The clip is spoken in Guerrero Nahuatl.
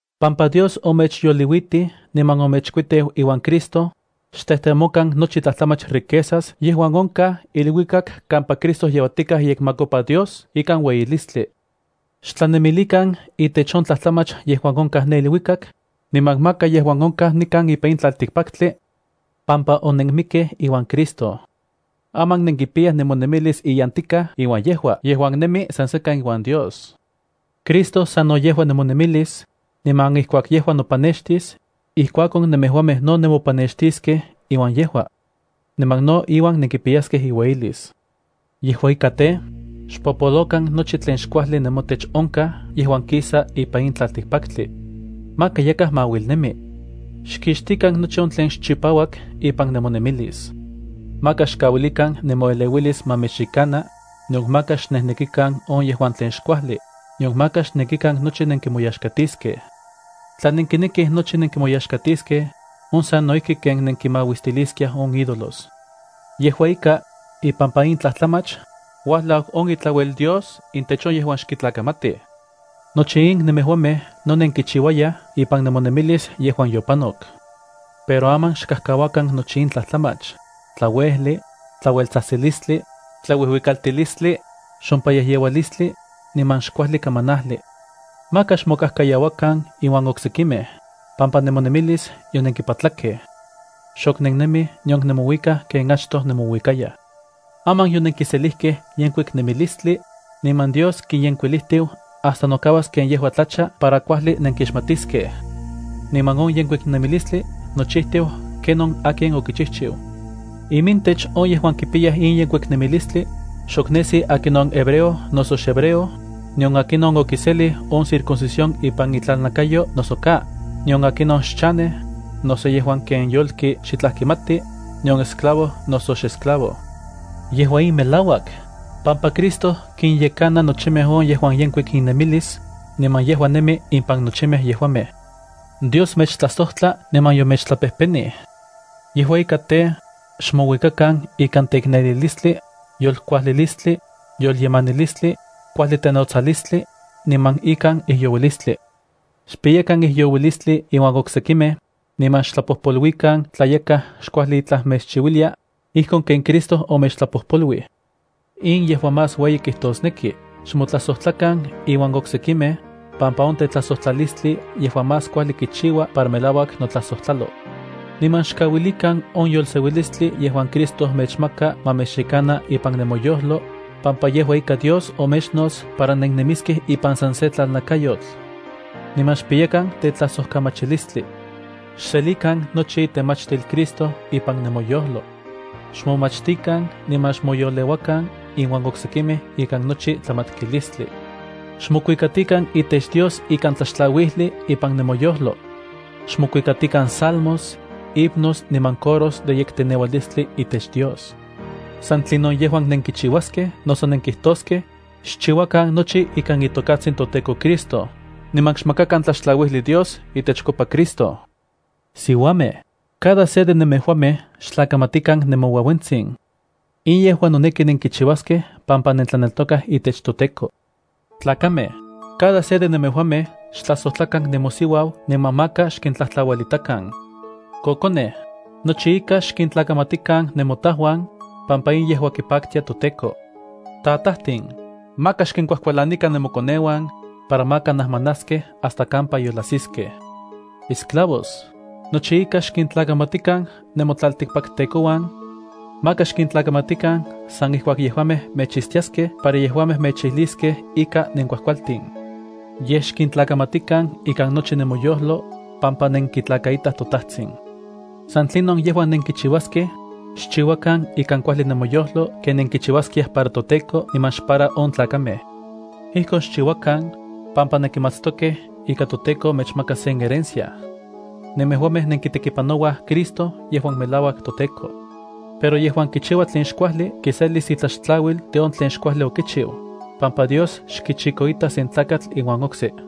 Pampa Dios omechyoliuitij niman omechkuiteu iuan Cristo, xtejtemokan nochi tlajtlamach riquezas yejuan onkaj iluikak kampa Cristo yeuatikaj iyekmakopa Dios ikan ueyilistli. Xtlanemilikan itech on tlajtlamach yejuan onkaj ne iluikak, niman maka yejuan onkaj nikan ipan in tlaltikpaktli, pampa onenmikkej iuan Cristo. Aman nenkipiyaj nemonemilis iyantikaj iuan yejua yejuan nemi san sekan iuan Dios. Cristo sano yejua nemonemilis, niman ijkuak yejua nopanextis, ijkuakon nemejuamej no nemopanextiskej iuan yejua. Niman no iuan nenkipiyaskej iueyilis. Yejua ika tej, xpopolokan nochi tlen xkuajli nemotech onkaj yejuan kisa ipan in tlaltikpaktli. Maka yakaj ma auilnemi. Xkixtikan nochi on tlen xchipauak ipan nemonemilis. Maka xkauilikan nemoeleuilis ma mechyekana, nion maka xnejnekikan on yejuan tlen xkuajli, nion maka xnekikan nochi nenkimoyaxkatiskej. Tla nenkinekij nochi nenkimoyaxkatiskej, on sano ijki ken nenkimauistiliskiaj on ídolos. Yejua ika, ipampa in tlajtlamach, uajlau on itlauel Dios intech on yejuan xkitlakamatij. Nochi in nemejuamej no nenkichiuayaj ipan nemonemilis yejuan yopanok. Pero aman xkajkauakan nochi in tlajtlamach: tlauejli, tlaueltsajtsilistli, tlauijuikaltilistli, xompayejyeualistli, niman xkuajli kamanajli. Maka xmokajkayauakan iuan oksekimej, pampa nemonemilis yonenkipatlakej. Xok nennemij nion nemouikaj ken achtoj nemouikayaj. Aman yonenkiselijkej yenkuik nemilistli, niman Dios kiyenkuilijtiu hasta nokauas ken yejua tlacha para kuajli nenkixmatiskej. Niman on yenkuik nemilistli nochijtiu ken on akin okichijchiu. Imintech on yejuan kipiyaj in yenkuik nemilistli, xok nesi akinon xhebreo noso hebreo, nion akinon okiselij on circuncisión ipan itlalnakayo noso ka, nion akinon xchanej, noso yejuan ken yolki yejuan xitlaj kimati, nion esclavo, noso xesclavo. Yejua in melauak, pampa Cristo kinyekana nochimej on yejuan yenkuik innemilis, niman yejua nemi impan nochimej yejuamej. Dios mechtlajsojtla niman yomechtlapejpenij. Yejua ika tej, xmouikakan ikan teiknelilistli, yolkuajlilistli, yolyemanilistli, kuajli tenotsalistli, niman ikan ijyouilistli. Xpiyakan ijyouilistli iuan oksekimej, niman xtlapojpoluikan tla yakaj xkuajli itlaj mechchiuilia, ijkon ken Cristo omechtlapojpoluij. In yejua más ueyi kijtosneki, xmotlajsojtlakan iuan oksekimej, pampa on tetlajsojtlalistli yejua más kuajli kichiua para melauak notlajsojtlalo. Niman xkauilikan on yolseuilistli yejuan Cristo mechmaka ma mechyekana ipan nemoyojlo, pampa yejua ika Dios omechnots para nennemiskej ipan san se tlalnakayotl. Niman xpiyakan tetlajsojkamachilistli. Xselikan nochi itemachtil Cristo ipan nemoyojlo. Xmomachtikan niman xmoyoleuakan iuan oksekimej ikan nochi tlamatkilistli. Xmokuikatikan itech Dios ikan tlaxtlauijli ipan nemoyojlo. Xmokuikatikan salmos, himnos niman coros de yekteneualistli itech Dios. San tlinon yejuan nenkichiuaskej noso nenkijtoskej, xchiuakan nochi ikan itokatsin toTEKO Cristo, niman xmakakan tlaxtlauijli Dios itechkopa Cristo. Siuamej, cada se de nemejuamej xtlakamatikan nemoueuentsin. In yejua noneki nenkichiuaskej pampa nentlaneltokaj itech toTEKO. Tlakamej, cada se de nemejuamej xtlajsojtlakan nemosiuau niman maka xkintlajtlauelitakan. Kokonej, nochi ika xkintlakamatikan nemotajuan, pampa in yejua kipaktia toTEKO. Tatajtin, maka xkinkuajkualanikan nemokoneuan, para maka najmanaskej hasta kampa yolajsiskej. Esclavos, nochi ika xkintlakamatikan nemotlaltikpaktekouan. Maka xkintlakamatikan san ijkuak yejuamej mechitstiaskej para yejuamej mechijliskej ika nenkuajkualtin. Yej, xkintlakamatikan ikan nochi nemoyojlo, pampa nenkitlakaitaj toTajtsin. San tlinon yejuan nenkichiuaskej, xchiuakan ikan kuajli nemoyojlo ken nenkichiuaskiaj para toTEKO niman xpara on tlakamej. Ijkon xchiuakan, pampa nenkimatstokej ika toTEKO mechmakas sen herencia. Nemejuamej nenkitekipanouaj Cristo yejuan melauak toTEKO. Pero yejuan kichiua tlen xkuajli kiselis itlaxtlauil de on tlen xkuajli okichiu, pampa Dios xkichikoita se tlakatl iuan okse.